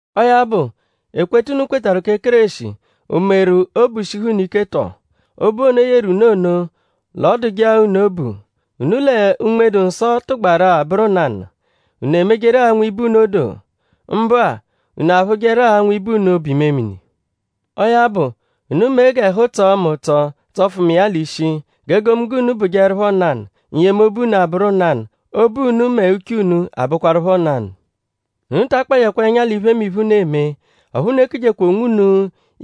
Ọo ya bụ; ekweta unu kwetarụ kẹ Kéreshi;?o meru obu shihu unu ike tọ? Obu ono, o yeru unu ono?l'ọ dụje-a unu obu??Unu lẹ Unme-dụ-Nsọ tụgbaru-a bụru nanụ??Unu emejeru-a nwibe unu odoo? Mbụ-a;?unu aphụjeru-a nwibe unu obu-imemini? Ọo ya bụ; unu mee g'ẹhu tsọo mu ụtso tsọfu mu iya l'ishi. G'egomunggo unu bụjeerupho nanụ; n-yemobu unu abụru nanụ; obu unu mẹ uche unu abụkwarupho nanụ. Unu ta akpajẹkwa ẹnya l'iphemiphe, unu eme. Ọphu unu ekujekwa onwunu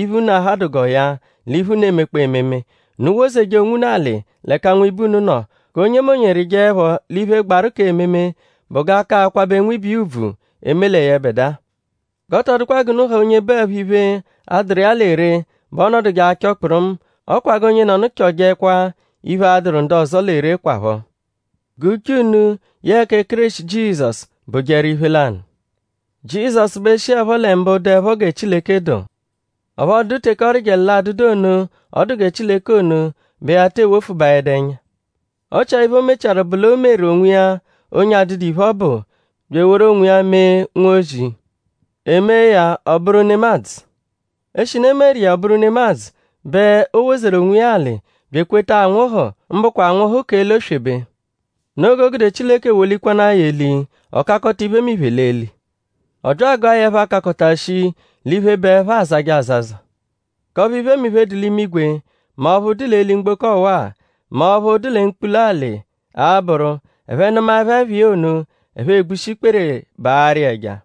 iphe, unu ahadụ g'ọo ya l'iphe, unu emekpọo ememe. Unu wozeje onwunu alị l'ẹka nwibe unu nọ. G'onyemonye rịjeepho l'iphe, gbaru k'ememe bụ g'a ka akwabẹ nwibe iya ùbvù; eme lẹ yẹbedua. G'ọ tọ dụkwa g'unu ha onye bụepho iphe, a-dụru iya lẹ ree bẹ ọonoduje achọ kpụrumu; ọ kwa g'onyenọnu chọjekwa iphe, a-dụru ndu ọzo lẹ ree kwaphọ. G'uche unu yẹe kẹ Kéreshi Jizọsu bụjeru iphe lanụ. Jizọsu bẹ shiẹpho lẹ mbụ dụepho gẹ Chileke dụ. Ọphu ọ dụdu teke ọ rịjeru l'adụdu ono ọ dụ gẹ Chileke ono bẹ ya tee wofubaẹdu ẹnya. Ọ chia iphe, o mechiaru bụ l'o meru onwiya onye adụdu iphe, ọ bụ; bya eworu onwiya mee nwozi. E mee ya ọ bụru nemadzụ. Eshinu e meru iya ọ bụru nemadzụ; bẹ o wozeru onwiya alị; bya ekweta anwụhu; mbụkwa anwụhu k'eli oswebe. Noo g'o gude Chileke wolikwanaa ya eli; ọ kakọta iphemiphe l'eli. Ọ bya agụa ya ẹpha, kakọta shii l'iphe, bụ ẹpha, aazajẹ azaza; k'ọphu iphemiphe, dụ l'imigwe; mẹ ọphu dụ l'eli mgboko ọwa-a; mẹ ọphu dụ lẹ mkpula alị a-bụru; ẹphe -nụmaepho ẹpha iya ono; ẹphe egbushi ikpere; baarụ iya ẹja;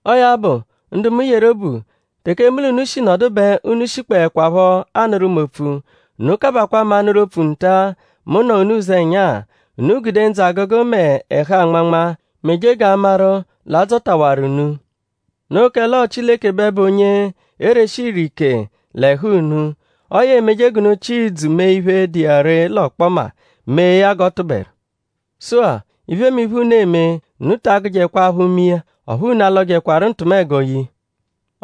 Ọo ya bụ; ndu mu yeru obu; teke mu l'unu shi nọdu bẹ unu shikpọekwapho anụru mu opfu. Unu kabakwaa mu anụru opfu nta-a, mu nọ unu ụzenya-a. Unu gude ndzụ-agụgu mẹ ẹhu-anmanma; meje g'a maru l'adzọtawaru unu. Noo kẹle ọo Chileke bẹ bụ onye ereshi ire ike l'ẹhu unu. Ọo ya emeje g'unu chịa ìdzù mee iphe, dụ iya ree l'ọkpoma; mee ya g'ọ tụberu. Sụ-a; iphemiphe, unu eme; unu ta agụjekwa aphụ me iya; ọphu unu alọjekwaru ntụmego ye iya.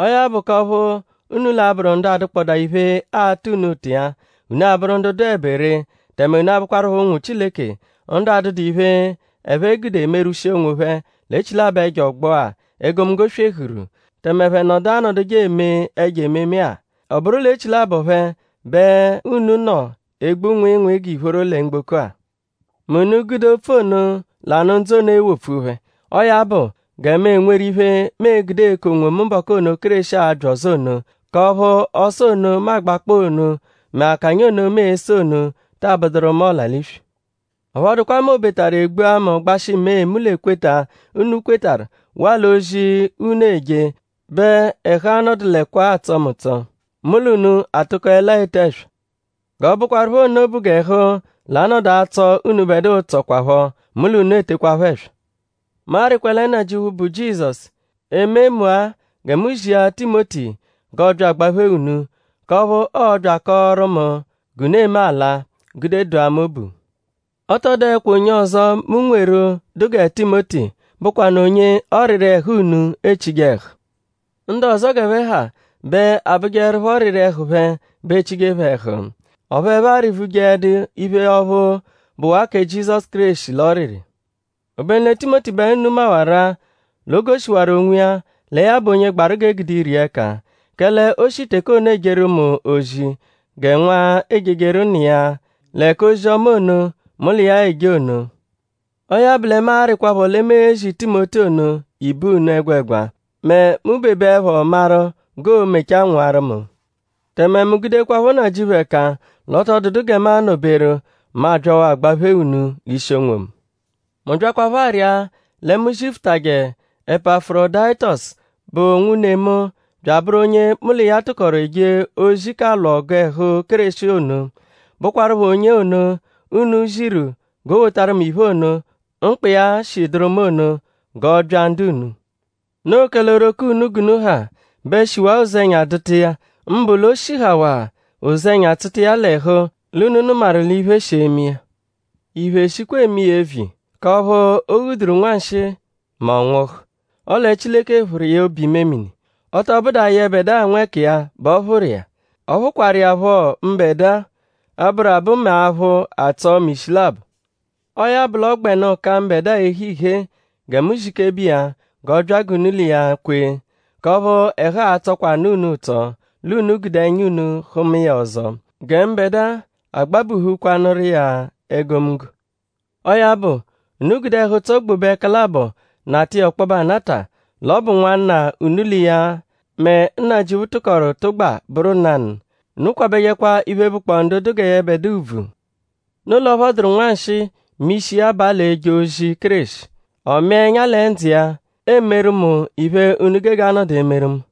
Ọo ya bụ k'ọphu unu l'a-bụru ndu adụkpodaa iphe, aata unu ụta iya; unu abụru ndu dụebe ree; tẹme unu abụkwarupho ụnwu Chileke; ndu adụdu iphe, ẹphe gude merwushia onwophẹ l'echilabọ ẹjo ọgbo-a, egomunggo swehuru; tẹme ẹphe nọdu anọduje eme ẹjo ememe-a. Ọ bụru l'echilabọ phẹ bẹ unu nọ egbu nwịinwii g'ìphóró lẹ mgboko-a; mẹ unu -gude opfu ono, l'anụ ndzụ ono ewopfu phẹ. Ọo ya bụ gẹ mu enweru iphe, mu e-gude eku onwomu mbọku ono, Kéreshi a-bya ọzo ono; k'ọphu ọso ono, mu agbakpọo ono mẹ akanya ono mu ese ono taa bụduru mu ọla-l'iswi. Ọphu ọ dụkwa mẹ obetaru e gbua mu gbashị mee mu l'ekweta, unu kwetarụ waa l'ozi unu eje bẹ ẹhu a-nọdulekwa-a atsọ mu ụtso; mu l'unu atụkolea ete ẹswa. G'ọ bụkwarupho nno bụ g'ẹhu l'a-nọdu atsọ unubẹdua ụtso kwaphọ; mu l'unu etekwaphọ ẹswa. Mu arịkwa lẹ Nnajịuphu, bụ Jizọsu eme mu-a gẹ mu zia Timoti g'ọ bya agbaphee unu; k'ọphu ọo-bya akọoru mu g'unu eme ala; gude dụa mu obu. Ọ tọ dụekwa onye ọzo, mu nweru, dụ gẹ Timoti, bụkwanu onye ọriri ẹhu unu echije ẹhu. Ndu ọzo g'ẹphe ha bẹ abụjeerupho ọriri ẹhu phẹ bẹ echije phẹ ẹhu. Ọphu ẹphe arị-vujeẹdu iphe ọphu bụwaa kẹ Jizọsu Kéreshi l'ọriri. Obenu lẹ Timoti bẹ unu mawaru-a l'o goshiwaru onwiya lẹ ya bụ onye gbaru g'e gude ire iya ẹka. Kẹle o shi teke ono ejeru mu ozi gẹ nwa ejejeru nna iya lẹ k'ozi-ọma ono mu l'iya eje ono. Ọo ya bụ lẹ mu arịkwapho lẹ mu e-zi Timoti ono ibe unu ẹgwegwa mẹ mu -bebeẹpho maru g'oo-mechaa nwụaru mu. Tẹme mu gudekwaphọ Nnajịuphu ẹka l'ọ tọ dụdu gẹ mu anọ-beru; mu abyawaa agbaphee unu l'ishi onwomu. Mu byakwaphọ arịa lẹ mu zifutajẹ Epafurodayitosu, bụ nwune mu bya abụru onye mu l'iya tụkoru eje ozi k'alwụ ọgu ẹhu Kéreshi ono; bụkwarupho onye ono, unu ziru g'o wotaru mu iphe ono, mkpa iya shi dụru mu ono; g'ọ bya ndu unu. Noo kẹle oghoroko unu g'unu ha bẹ shiwaa ụzenya dụta iya; mbụ l'o shihawaa ụzenya tsụta iya l'ẹhu l'unu nụmaru l'iphe shi eme iya. Iphe shikwaa eme iya eviya; k'ọphu o ghuduru nwanshịi mẹ ọ nwụhu. Ọle Chileke phụru iya obu-imemini. Ọ tọ bụdua yẹbedua nwẹkiya bẹ ọ phụru iya. Ọ phụkwaru iya phọ mbẹdua; ọ-bụru-abụ mẹ aphụ atsọ mu ishi labọ. Ọo ya bụ l'ọ gbẹnu ka mbẹdua ehe ihee gẹ mu zikebe iya g'ọ bya g'unu l'iya kwee; k'ọphu ẹhu a-tsọkwanu unu ụtso l'unu gude ẹnya unu hụma iya ọzo; gẹ mbẹdua agbabuhukwanụru iya egomunggo. Ọo ya bụ; unu gude ẹhu-ụtso gbobe ẹka labọ nata iya ọkpobe anata; l'ọ bụ nwanna, unu l'iya mẹ Nnajịuphu tụkoru tụgba bụru nanụ. Unu kwabẹjekwa iphe, bụkpoo ndu dụ gẹ yẹbedua ùbvù. Noo l'ọ phọduru nwanshịi mẹ ishi iya abaa l'eje ozi Kéreshi. Ọ mịa ẹnya lẹ ndzụ iya; emeru mu iphe unu gege anọdu emeru mu.